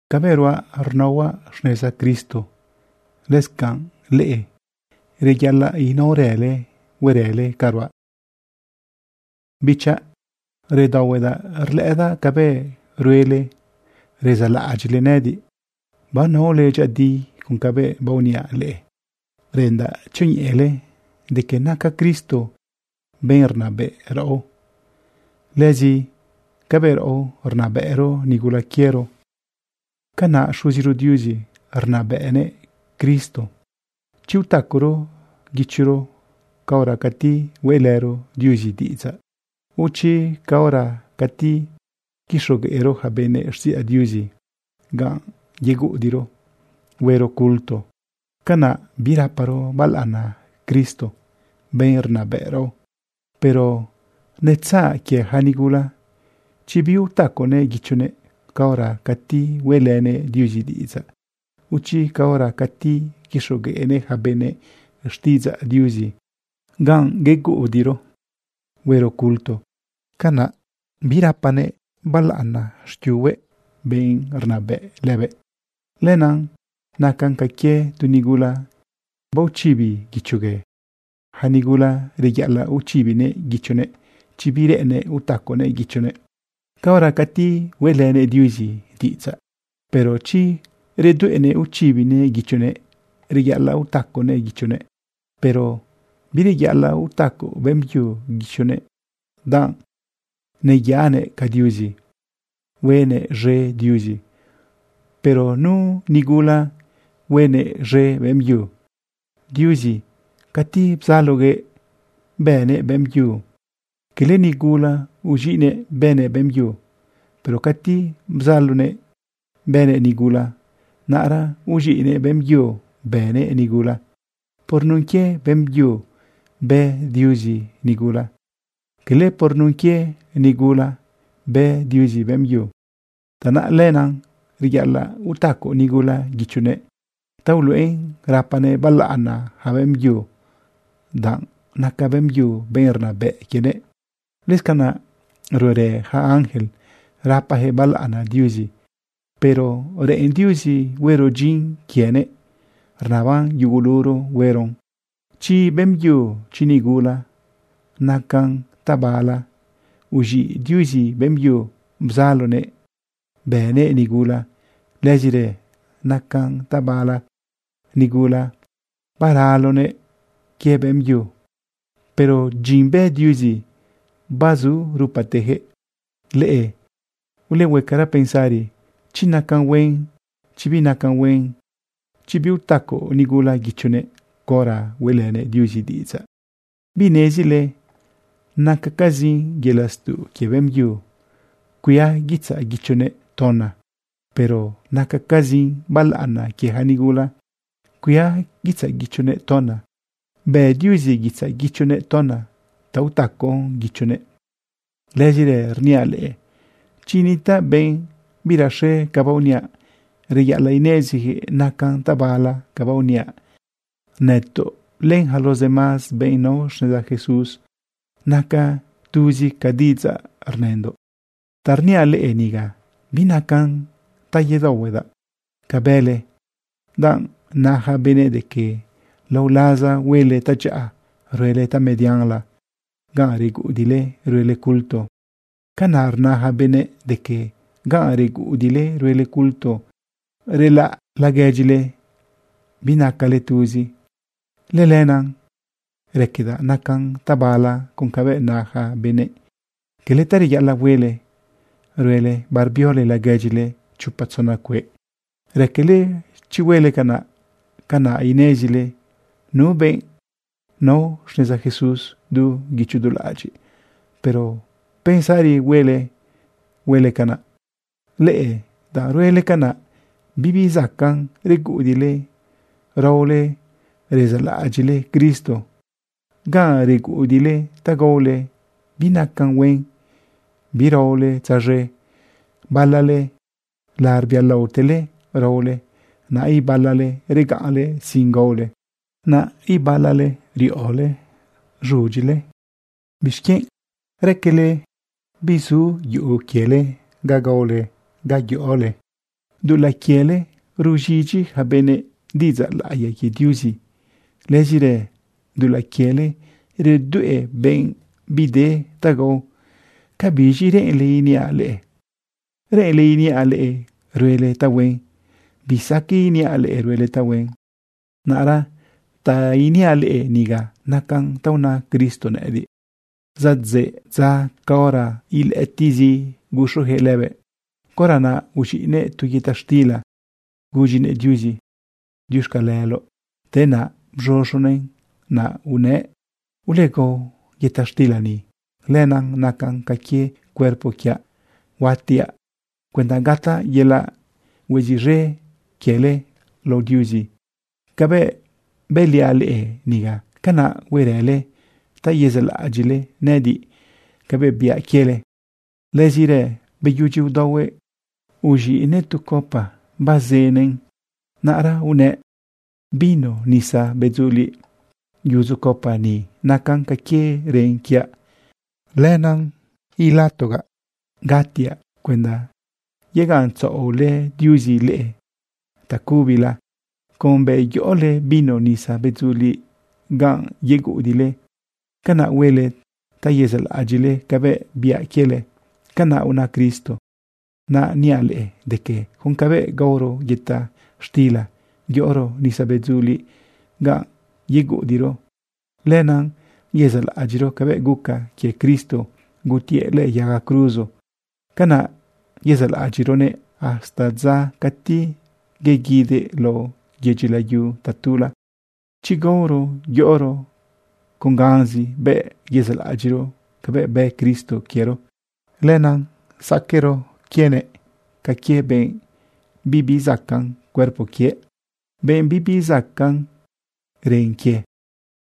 Cabëꞌ ruaꞌ rnaohuaꞌ xneza Cristo, lëscanꞌ leꞌe reyaꞌalaꞌ inaorële huerële ca ruaꞌ. Bichaꞌ, redaohuedaꞌ rlëꞌëdaꞌ cabëꞌ ruele rezaꞌlaꞌadyiꞌle nëꞌëdiꞌ, banaole dyëꞌëdi con cabëꞌ baoniaꞌ leꞌe. Reꞌendaꞌ tzioñeꞌele de que naca Cristo benꞌ rnabëꞌ raꞌo. Lëzi cabëꞌ raꞌo rnabëꞌro nigula quiero, canaꞌ Xuziro Diuzi arnabëꞌnëꞌ Cristo. Chi utacoro guichoro caora cati hueꞌlëro Diuzi diꞌidzaꞌ, o chi caora cati quixogueꞌro yaca benëꞌ xtiꞌidzaꞌ Diuzi ganꞌ yeguꞌudiꞌro huero culto, canaꞌ biraparo balaꞌana Cristo, benꞌ rnabëꞌ raꞌo. Pero netzaꞌ quie yaca nigula, chi biutaconëꞌ guichonëꞌ caora cati hueꞌlënëꞌ Diuzi diꞌidzaꞌ, o chi caora cati quixogueꞌnëꞌ yaca benëꞌ xtiꞌidzaꞌ Diuzi ganꞌ yeguꞌudiꞌro huero culto, canaꞌ birapanëꞌ balaꞌana xquiunëꞌ, benꞌ rnabëꞌ lëbëꞌ. Lenaꞌ nacan ca quie tu nigula baochibi guichogue. Yaca nigula reyaꞌalaꞌ uchibinëꞌ guichonëꞌ chi bireꞌennëꞌ utaconëꞌ guichonëꞌꞌ caora cati hueꞌlënëꞌ Diuzi diꞌidzaꞌ. Pero chi redueꞌnëꞌ uchibinëꞌ guichonëꞌ, reyaꞌalaꞌ utaconëꞌ guichonëꞌ. Pero bireyaꞌalaꞌ utaco beꞌmbyu guichonëꞌ, danꞌ neyaꞌanëꞌ ca Diuzi, huenëꞌ z̃e Diuzi. Pero nu nigula huenëꞌ z̃e beꞌmbyu. Diuzi, cati bzaloguëꞌ bëguëꞌ beꞌmbyu, cala nigula uz̃iꞌguëꞌ bëguëꞌ beꞌmbyu. Pero cati bzaloguëꞌ bëguëꞌ nigula, naꞌra uz̃iꞌguëꞌ beꞌmbyu bëguëꞌ nigula. Por nun quie beꞌmbyu bë Diuzi nigula. Cala por nun quie nigula bë Diuzi beꞌmbyu. Tanaꞌ lenaꞌ reyaꞌalaꞌ utaco nigula guichonëꞌ ta uluꞌen rapanëꞌ balaꞌana yaca beꞌmbyu, danꞌ naca beꞌmbyu benꞌ rnabëꞌ quienëꞌ. Lëscanaꞌ ruerë yaca ángel rapayaquëꞌ balaꞌana Diuzi. Pero reꞌen Diuzi huero dyin quienëꞌ. Rnaban yuguluro hueron, chi beꞌmbyu, chi nigula. Nacan tabala uz̃iꞌ Diuzi beꞌmbyu bzaloguëꞌ bëguëꞌ nigula. Lëzirë nacan tabala nigula baraloguëꞌ quie beꞌmbyu. Pero dyin bë Diuzi bazu rupateyaquëꞌ. Leꞌe ulehuecara pensari chi nacan huen, chi binacan huen, chi biutaco nigula guichonëꞌ caora hueꞌlënëꞌ Diuzi diꞌidzaꞌ. ¿Binezile nacacazin yelaꞌ stuꞌ quie beꞌmbyu cuia guitzaꞌ guichonëꞌ tona? Pero nacacazin balaꞌana quie yaca nigula cuia guitzaꞌ guichonëꞌ tona. Bë Diuzi guitzaꞌ guichonëꞌ tona ta utacon guichonëꞌ. Lëzirë rniaꞌ leꞌe chi nitaꞌ benꞌ biraxe ca baoniaꞌ, reyaꞌalaꞌ ineziyaquëꞌ nacan tabala ca baoniaꞌ. Nëtoꞌ len yaca los demás benꞌ nao xneza Jesús, naca tuzi ca diꞌidzaꞌ rnëndoꞌ. Ta rniaꞌ leꞌe niga binacan ta yedaohuedaꞌ ca bële, danꞌ na yaca benëꞌ de que lao laza huele tadyaꞌa, ruele tamedianla ganꞌ reguꞌudiꞌle ruele culto. Canaꞌ rna yaca benëꞌ de que ganꞌ reguꞌudiꞌle ruele culto relaꞌ laguedyile binacale tuzi. Lëlenaꞌ raquedaꞌ nacan tabala con cabëꞌ na yaca benëꞌ. Cala ta reyaꞌalaꞌ huele ruele barbiole laguedyile chopa tzona cueꞌ. Raquele chi huele canaꞌ, canaꞌ inezile nu benꞌ nao xneza Jesús du guicho du laꞌadyiꞌ, pero pensarizi huele huele canaꞌ. Leꞌe danꞌ ruele canaꞌ, bibi zacaꞌn reguꞌudiꞌle raole rezaꞌlaꞌadyiꞌle Cristo. Ganꞌ reguꞌudiꞌle ta gaole binacan huen biraole tzaz̃e. Balale larbialaotele raole. Naꞌ ibalale regaꞌnle sin gaole. Naꞌ ibalale riꞌole z̃udyile. ¿Bixquienꞌ raquele bizu yuꞌu quiele ga gaole, ga yoꞌole? Dulaꞌ quiele ruz̃idyi yaca benëꞌ diꞌidzaꞌ laꞌiya quie Diuzi. Lëzirë dulaꞌ quiele redueꞌ benꞌ bi de ta gao. ¿Cabiz̃i reꞌenle iniaꞌ leꞌe? ¿Reꞌenle iniaꞌ leꞌe ruele tahuen? Bisaqueꞌ iniaꞌ leꞌe ruele tahuen. Naꞌra ta iniaꞌ leꞌe niga nacan ta una Cristo nëꞌëdiꞌ: Zadzeꞌ dza caora ilëꞌëtiꞌzi guxuyaquëꞌ lëbëꞌ, caora naꞌ uz̃iꞌnëꞌ tu yëta xtila gudyinëꞌ Diuzi: “Diuxcaleloꞌ.” Te naꞌ bz̃uz̃unëꞌn naꞌ unëꞌ: “Ulegao yëta xtila ni. Lenaꞌ nacan ca quie cuerpo quiaꞌ. Huatiaꞌ cuenda gataꞌ yelaꞌ hueziꞌz̃e quiele lao Diuzi. Cabëꞌ bëliaꞌ leꞌe niga, canaꞌ huerële ta yezaꞌlaꞌadyiꞌle nëꞌëdiꞌ cabëꞌ biaꞌ quiele.” Lëzirë beyudyi udaohuëꞌ, uz̃iꞌnëꞌ tu copa bazënëꞌn. Naꞌra unëꞌ: “Vino nisa bedzuliꞌ yudzu copa ni nacan ca quie ren quiaꞌ. Lenaꞌ ilatogaꞌ gatiaꞌ cuenda yegaꞌntzaꞌolë Diuzi leꞌe tacubila. Con bëꞌ yoꞌole vino nisa bedzuliꞌ ganꞌ yeguꞌudiꞌle, canaꞌ huele ta yezaꞌlaꞌadyiꞌle cabëꞌ biaꞌ quiele.” Canaꞌ una Cristo. Naꞌ niaꞌ leꞌe de que con cabëꞌ gaoro yëta xtila yoꞌoro nisa bedzuliꞌ ganꞌ yeguꞌudiꞌro, lenaꞌ yezaꞌlaꞌadyiꞌro cabëꞌ guca quie Cristo gutiëꞌ lëꞌë yaga cruzo. Canaꞌ yezaꞌlaꞌadyiꞌroguëꞌ hasta dza cati yeguidëꞌ lao yedyi layu tatula. Chi gaoro yoꞌoro con ganzi bëꞌ yezaꞌlaꞌadyiꞌro cabëꞌ bë Cristo quiero, lenaꞌ saquero quienëꞌ ca quie benꞌ bibi zacaꞌn cuerpo quie, benꞌ bibi zacaꞌn ren quie.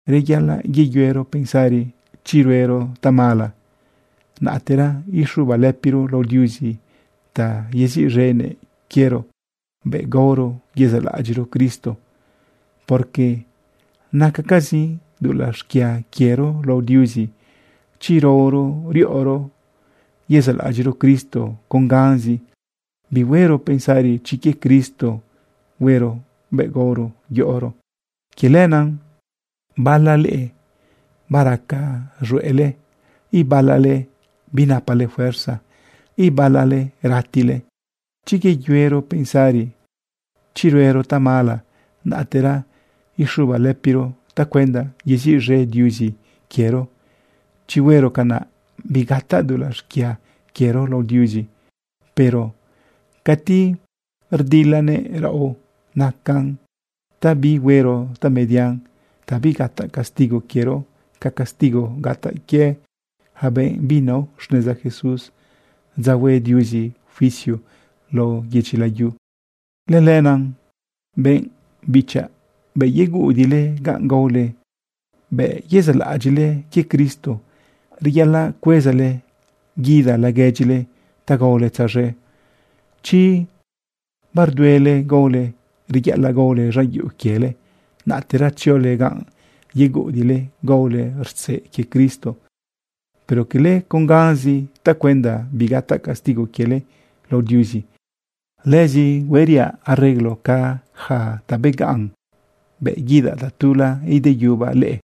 Reyaꞌalaꞌ yeyuero pensari chi ruero tamala, naꞌtera ixubalëpiro lao Diuzi ta yeziꞌz̃enëꞌ quiero bëꞌ gaoro yezaꞌlaꞌadyiꞌro Cristo. Porque nacacazin dulaꞌ xquia quiero lao Diuzi chi raoro riꞌoro yezaꞌlaꞌadyiꞌro Cristo con ganzi, bihuero pensari chi quie Cristo hueron bëꞌ gaoro yoꞌoro. Quie lenaꞌ bala leꞌe baraca z̃hueꞌle, ibala leꞌe binapale fuerza, ibala leꞌe ratile. Chi yeyuero pensari chi ruero tamala, naꞌtera ixubalëpiro tacuenda yeziꞌz̃e Diuzi quiero, chi huero canaꞌ, bigataꞌ dulaꞌ xquia quiero lao Diuzi. Pero cati rdilanëꞌ raꞌo, nacan ta bihuero tamedian ta bigataꞌ castigo quiero ca castigo gataꞌ quie yaca benꞌ binao xneza Jesús dza hue Diuzi juicio lao yedyi layu. Lëlenaꞌ benꞌ bichaꞌ, bëꞌ yeguꞌudiꞌle ganꞌ gaole bëꞌ yezaꞌlaꞌadyiꞌle quie Cristo, reyaꞌalaꞌ cuezale guida laguedyile ta gaole tzaz̃e. Chi barduele gaole, reyaꞌalaꞌ gaole z̃an yuꞌu quiele, naꞌtera tziole ganꞌ yeguꞌudiꞌle gaole rtzeꞌ quie Cristo, pero cala con ganzi tacuenda bigataꞌ castigo quiele lao Diuzi. Lëzi hueriaꞌ arreglo ca yaca ta beganꞌ bëꞌ guidaꞌ tatula ideyubaꞌ leꞌe.